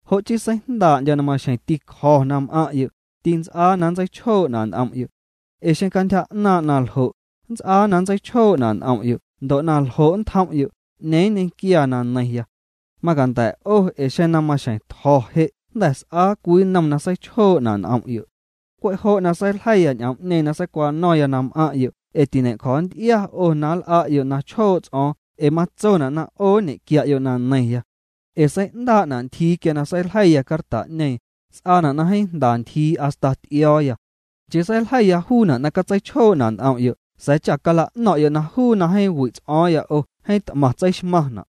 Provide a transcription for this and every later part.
Jo' chii seijndaa'ndyo̱ na maxjeⁿ tîcjo̱ na m'aⁿ'yo', tints'aa na nntseichjoo'na' n'om'yo'. Ee xeⁿ cantyja 'naaⁿ' na ljo', nnts'aa na nntseichjoo'na' n'om'yo' ndo' na ljo' ntjom'yo', ¿'ñeeⁿ nñequiaa na neiⁿya? Macanda̱ 'o ee xeⁿ na maxjeⁿ tjo̱ je' jnda̱ s'aa cwii nnom na seichjoo'na' n'om'yo'. Cwe' jo' na seiljeiya ñ'oom'ñeeⁿ na seicwano̱ⁿya na m'aⁿ'yo' ee tiñe'cjo̱nty'ia 'o na nl'a'yo' na chjoo' ts'o̱o̱ⁿ ee matsona' na 'o nñequia'yo' na neiⁿya. Ee sei'ndaa'na' ntyjiiya quia seiljeiya carta'ñeeⁿ, s'aana' na jeeⁿ jnda ntyjiiya hasta ty'io̱o̱ya. Nchii seiljeiya juuna' na catseichjoo'na' n'om'yo' sa̱a̱ cha cala'no̱ⁿ'yo' na juu na jeeⁿ wi' ts'o̱o̱ⁿya 'o jeeⁿ t'maⁿ tseixmaⁿna'.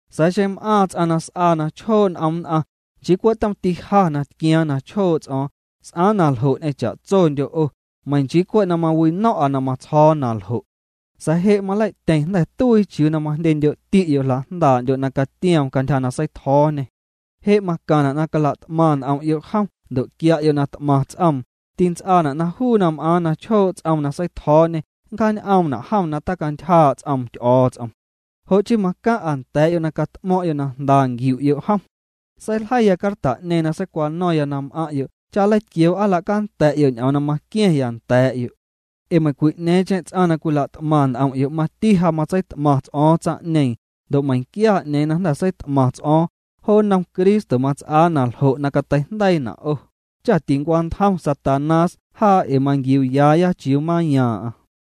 Sa̱a̱ xeⁿ m'aaⁿ ts'aⁿ na s'aa na chjoo' n'om nn'aⁿ, nchii cwe' tomti ja na tquiaaⁿ na chjoo' ts'o̱o̱ⁿ, s'aaⁿ na ljo' ñ'eⁿ cha'tsondyo' 'o, meiⁿ nchii cwe' na mawino̱ⁿ'a na matsjo̱o̱ na ljo'. Sa̱a̱ je' malei'tyeⁿ jnda̱ tuii chiuu na majndyendyo'ti'yo' jla'jndaa'ndyo' na catioom cantyja na seitjo̱o̱ñê. Je' macaⁿna' na cala't'maⁿ n'om'yo' jom ndo' quia'yo' na t'maⁿ ts'oom, tints'aana' na juu na m'aaⁿ na chjoo' ts'oom na seitjo̱o̱ñê nncjan'oomna' jom na tacantyjaa' ts'oom Ty'o̱o̱ts'om. Jo' chii macaⁿ'a nda̱a̱'yo' na cat'mo̱ⁿ'yo' na jnda nquiu'yo' jom. Seiljeiya carta'ñeeⁿ na seicwano̱ⁿya na m'aⁿ'yo' cha nleitquioo' aa nla'canda̱'yo' ñ'oom na maqua̱ⁿya nda̱a̱'yo'. Ee meiⁿcwi'ñeeⁿcheⁿ ts'aⁿ na cwila't'maⁿ n'om'yo' mati ja matseit'maⁿ ts'o̱o̱ⁿ tsaⁿ'ñeeⁿ, ndo' meiⁿnquia 'ñeeⁿ na jnda̱ seit'maⁿ ts'o̱o̱ⁿ, jo nnom Cristo mats'aa na ljo' na cateijndeiina' 'o, cha tincwantjom Satanás jaa ee manquiuuyaaya chiuu mayaaⁿ'aⁿ.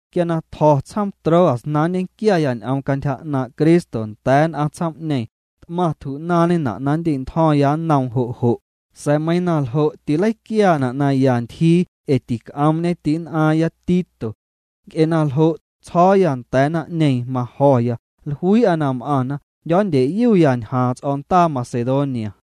Quia na tjo̱ tsjoom Troas na nñequiaya ñ'oom cantyja 'naaⁿ' Cristo nda̱a̱ nn'aⁿ tsjoom'ñeeⁿ, t'maⁿ tju'naaⁿñena' na nndi'ntjo̱ⁿya nnoom jo' jo', sa̱a̱ meiiⁿ na ljo' tîleiquiaana' na ya ntyjii ee tîc'oomñe ti'nn'aaⁿya Tito. Nc'e na ljo', tsjo̱o̱ya nda̱a̱ naⁿ'ñeeⁿ majo̱ya, jluii'a na m'aⁿna, jndyo̱o̱ndyeyuya ñjaaⁿ ts'o̱ndaa Macedonia.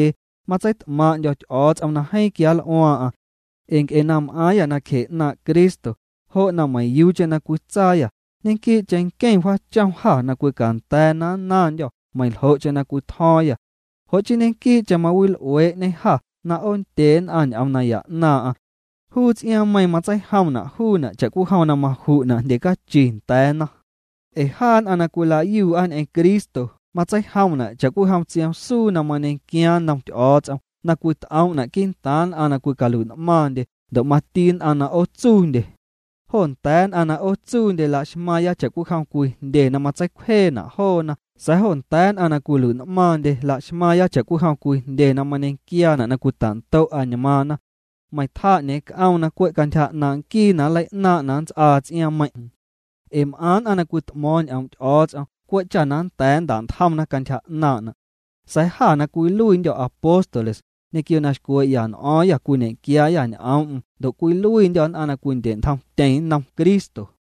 Matseit'maaⁿ'ndyo̱ Ty'o̱o̱ts'om na jeeⁿ quianl'uaaⁿ'aⁿ. Ee nc'e na m'aaⁿyâ nacje 'naaⁿ' Cristo, jo' na meiⁿyuucheⁿ na cwitsaayâ, ñequii'cheⁿ nqueⁿ wjaachom jâ na cwicanda̱a̱ na nnaⁿndyô̱ meiⁿljo'cheⁿ na cwitjo̱o̱ⁿyâ. Jo' chii ñequii'cheⁿ mawil'uee'ñê jâ na 'oondye nn'aⁿ ñ'oom naya 'naaⁿ'aⁿ. Juu ts'iaaⁿmeiiⁿ matseijomna' juuna' cha'cwijom na maju'na' jndye cachi nda̱a̱na. Ee jaa nn'aⁿ na cwilayuu'a ñ'eⁿ Cristo matseijomna' cha'cwijom tsioom suu na mañequiaaⁿ nnom Ty'o̱o̱ts'om na cwit'oom'na' quii'ntaaⁿ nn'aⁿ na cwicalui'n'maaⁿndye ndo' mati nn'aⁿ na 'ootsuundyena. Jo nda̱a̱ nn'aⁿ na 'ootsuundye laxmaaⁿya cha'cwijom cwii jndye na matseicwjeena' joona sa̱a̱ jo nda̱a̱ nn'aⁿ na cwilui'n'maaⁿndye laxmaaⁿya cha'cwijom cwii jndye na mañequiaana' na cwita'ndo' añmaaⁿna. Meiⁿ tjaa 'ñeeⁿ c'oom na cwe' cantyja 'naaⁿ' nquii na nleinaaⁿ' na nnts'aa ts'iaaⁿmeiⁿ'. Ee m'aⁿ nn'aⁿ na cwit'mo̱o̱ⁿ ñ'oom' Ty'o̱o̱ts'om cwe' cha nnda̱a̱ nnta'ntjomna cantyja 'naaⁿ'na'. Sa̱a̱ jâ na cwiluiindyô̱ apóstoles, ñequio na xcwee'ya n'o̱o̱ⁿyâ cwiñe'quiaayâ ñ'oom'm ndo' cwiluiindyô̱ nn'aⁿ na cwindye'ntjomtyeⁿ nnom Cristo.